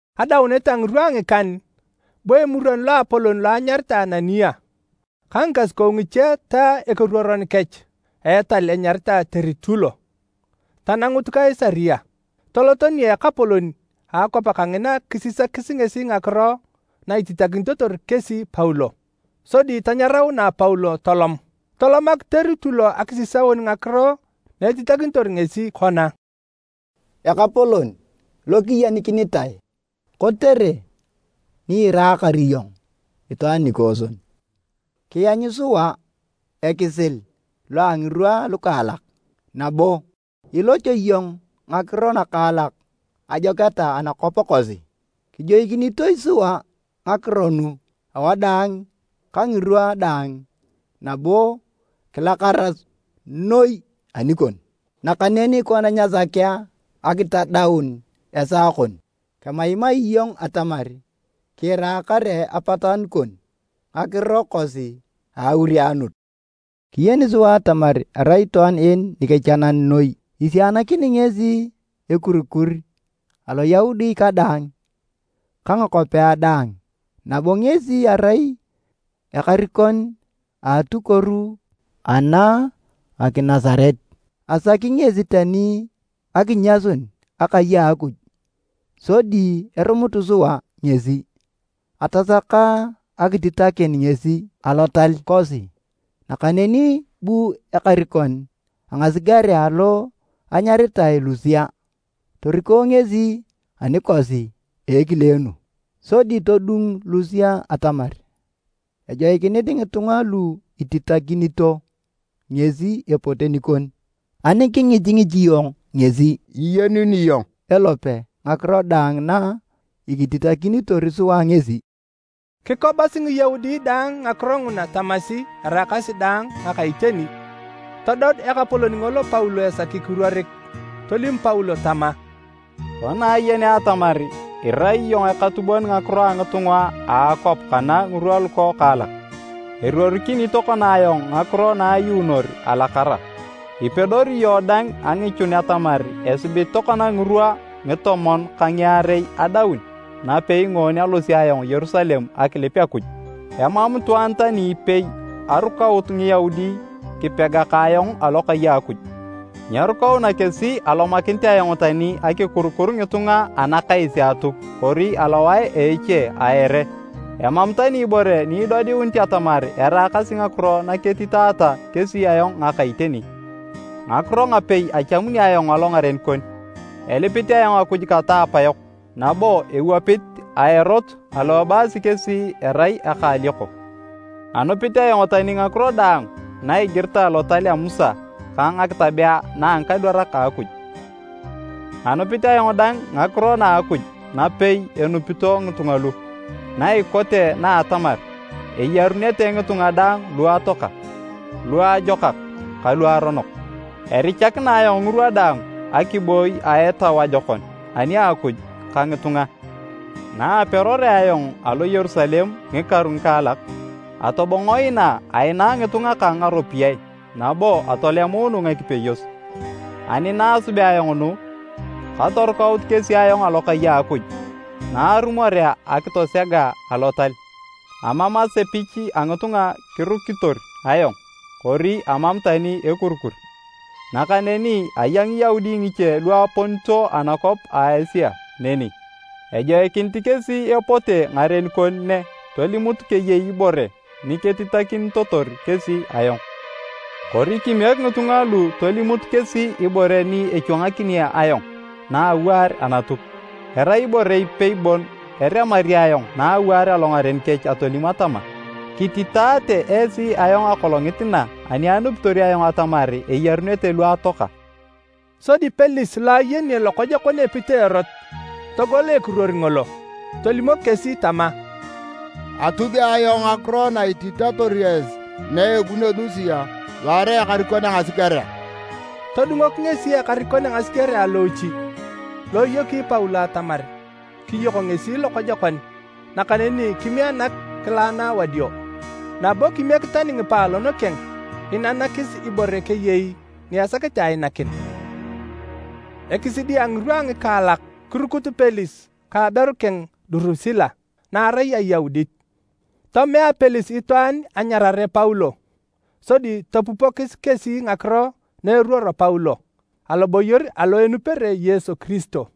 Adaunet a ngirwa a ngikan, bu Emuron Loapolon lo anyaritae Anania ka ngikasukou ngiche ta ekeruoron kech a etal enyaritae Teritulo, tanangut Kaisaria. Toloto nia ekapolon a akwap kangina kisisakis ngesi ngakiro na ititakinitotor kesi Paulo. Sodi tanyaraunae Paulo tolom. Tolomak Teritulo akisisaun ngakiro na etitakinitor ngesi kona, “Ekapolon lo kiyenikinitae! Kotere ni iraakar iyong itwaan nikooson, kianyu sua ekisil lo a ngirwa alukaalak. Nabo iloch iyong ngakiro nakaalak ajoketa anakwap kosi. Kijoikinito sua ngakiro nu awadaang ka ngirwa daang nabo kilakara noi anikon. Nakaneni kona nyasakea akitadaun esaa kon, kemaimai iyong atamar kiira kare a apatanu kon ngakiro kosi a aurianut. Kiyen sua atamar erai itwaan en nikechanan noi. Isianakini ngesi ekurikur Aloyaudi kadaang ka ngakwapea daang nabo ngesi erai ekarikon a atukuoru ana a Nginasaret. Asaki ngesi tani akinyasun akai a Akuj sodi erumutu sua ngesi. [Atasaka akititakin ngesi Alotal kosi nakaneni bu ekarikon a ngasigerea lo anyaritae Lusia toriko ngesi anikosi a ekileenu. Sodi todung Lusia atamar ejoikinit ngitunga lu ititakinito ngesi epote nikon.] Ani kingichingich iyong ngesi, iyenuni iyong elope ngakiro daang na kititakinitor sua ngesi.” Kikobasi Ngiyaudi dang ngakiro nguna tamasi eraakasi daang ngaka iteni. Todod ekapolon ngolo Paulo esaki kiruorik. Tolim Paulo tama, “Kona ayenea atamar irai iyong ekatubon ngakiro a ngitunga a akwap kana ngirwa lukwokaalak, eruorikini tokona ayong ngakiro na ayuunor alakara. Ipedori iyong dang angichun atamar esibit tokona ngirwa ngitomon ka ngiarei adaun napei ngoon alosio ayong Yerusalem akilip Akuj. Emam itwaan tani ipei arukaut Ngiyaudi kipega ka ayong alokai a Akuj. Nyerukauna kesi alomakinit ayong tani akikurukur ngitunga anakais a Atuk kori alowae a eche a ere. Emam tani ibore ni idodiunit atamar eraakasi ngakiro na ketitaata kesi ayong ngaka iteni. Ngakiro ngapei achamuni ayong alongaren kon, elipit ayong Akuj kata apayok, nabo ewapit a Erot alo ebaasi kesi erai eka a alioko. Anupit ayong tani ngakiro daang na igiritae Lotal a Musa ka ngakitabea na a ngikadwarak a Akuj. Anupit ayong dang ngakiro na a Akuj napei enupito ngitunga lu, na ikote na a atamar, eyarunete ngitunga daang lu atoaka, luajokak ka luaronok. Erichakina ayong ngirwa daang akiboi a etau ajokon ani a Akuj ka ngitunga. “Naaperorea ayong alo Yerusalem ngikaru ngikaalak, atobongo inaa aina ngitunga kang ngaropiyae nabo atolemuunu ngakipeyos. Ani na asubea ayong nu, katorukaut kesi ayong alokai a Akuj na arumorea akitosega alotal. Amam asepich a ngitunga kirukitor ayong kori amam tani ekurikur. Nakaneni aya Ngiyaudi ngiche lu aponito anakwap a Asia neni. Ejoikinit kesi epote ngaren kon ne tolimut keyei ibore niketitakinitotor kesi ayong. Kori kimiek ngitunga lu tolimut kesi ibore ni echwangakini ayong na awaar Anatuk, erai ibore ipei bon eremari ayong na awaar alongaren kech atolim atama, ‘Kititaate esi ayong akolongit na ani anupitor ayong atamar eyarunete lu atoaka.’” Sodi Pelis lo ayeni lokojokon epit a Erot, togol ekiruor ngolo. Tolimok kesi tama, “Atubi ayong ngakiro na ititator esi na ebunio Lusia lo erai ekarikon a ngasigerea.” Todungok ngesi ekarikon a ngasigerea loochi lo eyoki Paulo atamar kiyok ngesi lokojokon, nakaneni kimianak kilaana wadio, nabo kimiek tani ngipaalon keng inanakis ibore keyei ni esakete ainakin. Ekisidi a ngirwa a ngikaalak, kirukut Pelis ka aberu keng Durusila, na arai Ayaudit. Tomea Pelis itwaan anyarare Paulo sodi topupokis kesi ngakiro na eruoro Paulo aloboyor alo enupere Yesu Kiristo.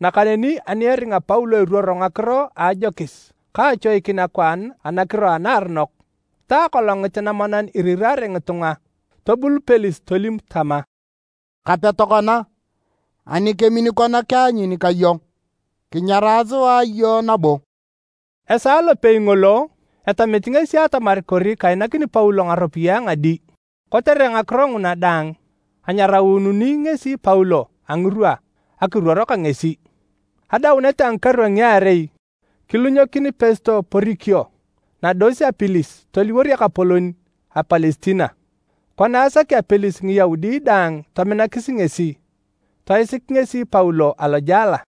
Nakaneni ani eringa Paulo iruoro ngakiro a ajokis ka achoikin akwaan anakiro anaaronok, ta Akolongit namonan iriraare ngitunga, tobul Pelis tolim tama, “Kape tokona. Ani kemin kona kianyun ka iyong, kinyarae sua iyong nabo.” Esaa lopei ngolo, etamit ngesi atamar kori kainakini Paulo ngaropiyae ngadi. Kotere ngakiro nguna dang, anyaraununi ngesi Paulo a ngirwa akiruor ka ngesi. Adaunet a ngikaru a ngiarei, kilunyokin Pesto Porikio nados a Pelis toliwor ekapolon a Palestina. Kona asakea Pelis Ngiyaudi daang tominakis ngesi, toisik ngesi Paulo alojela.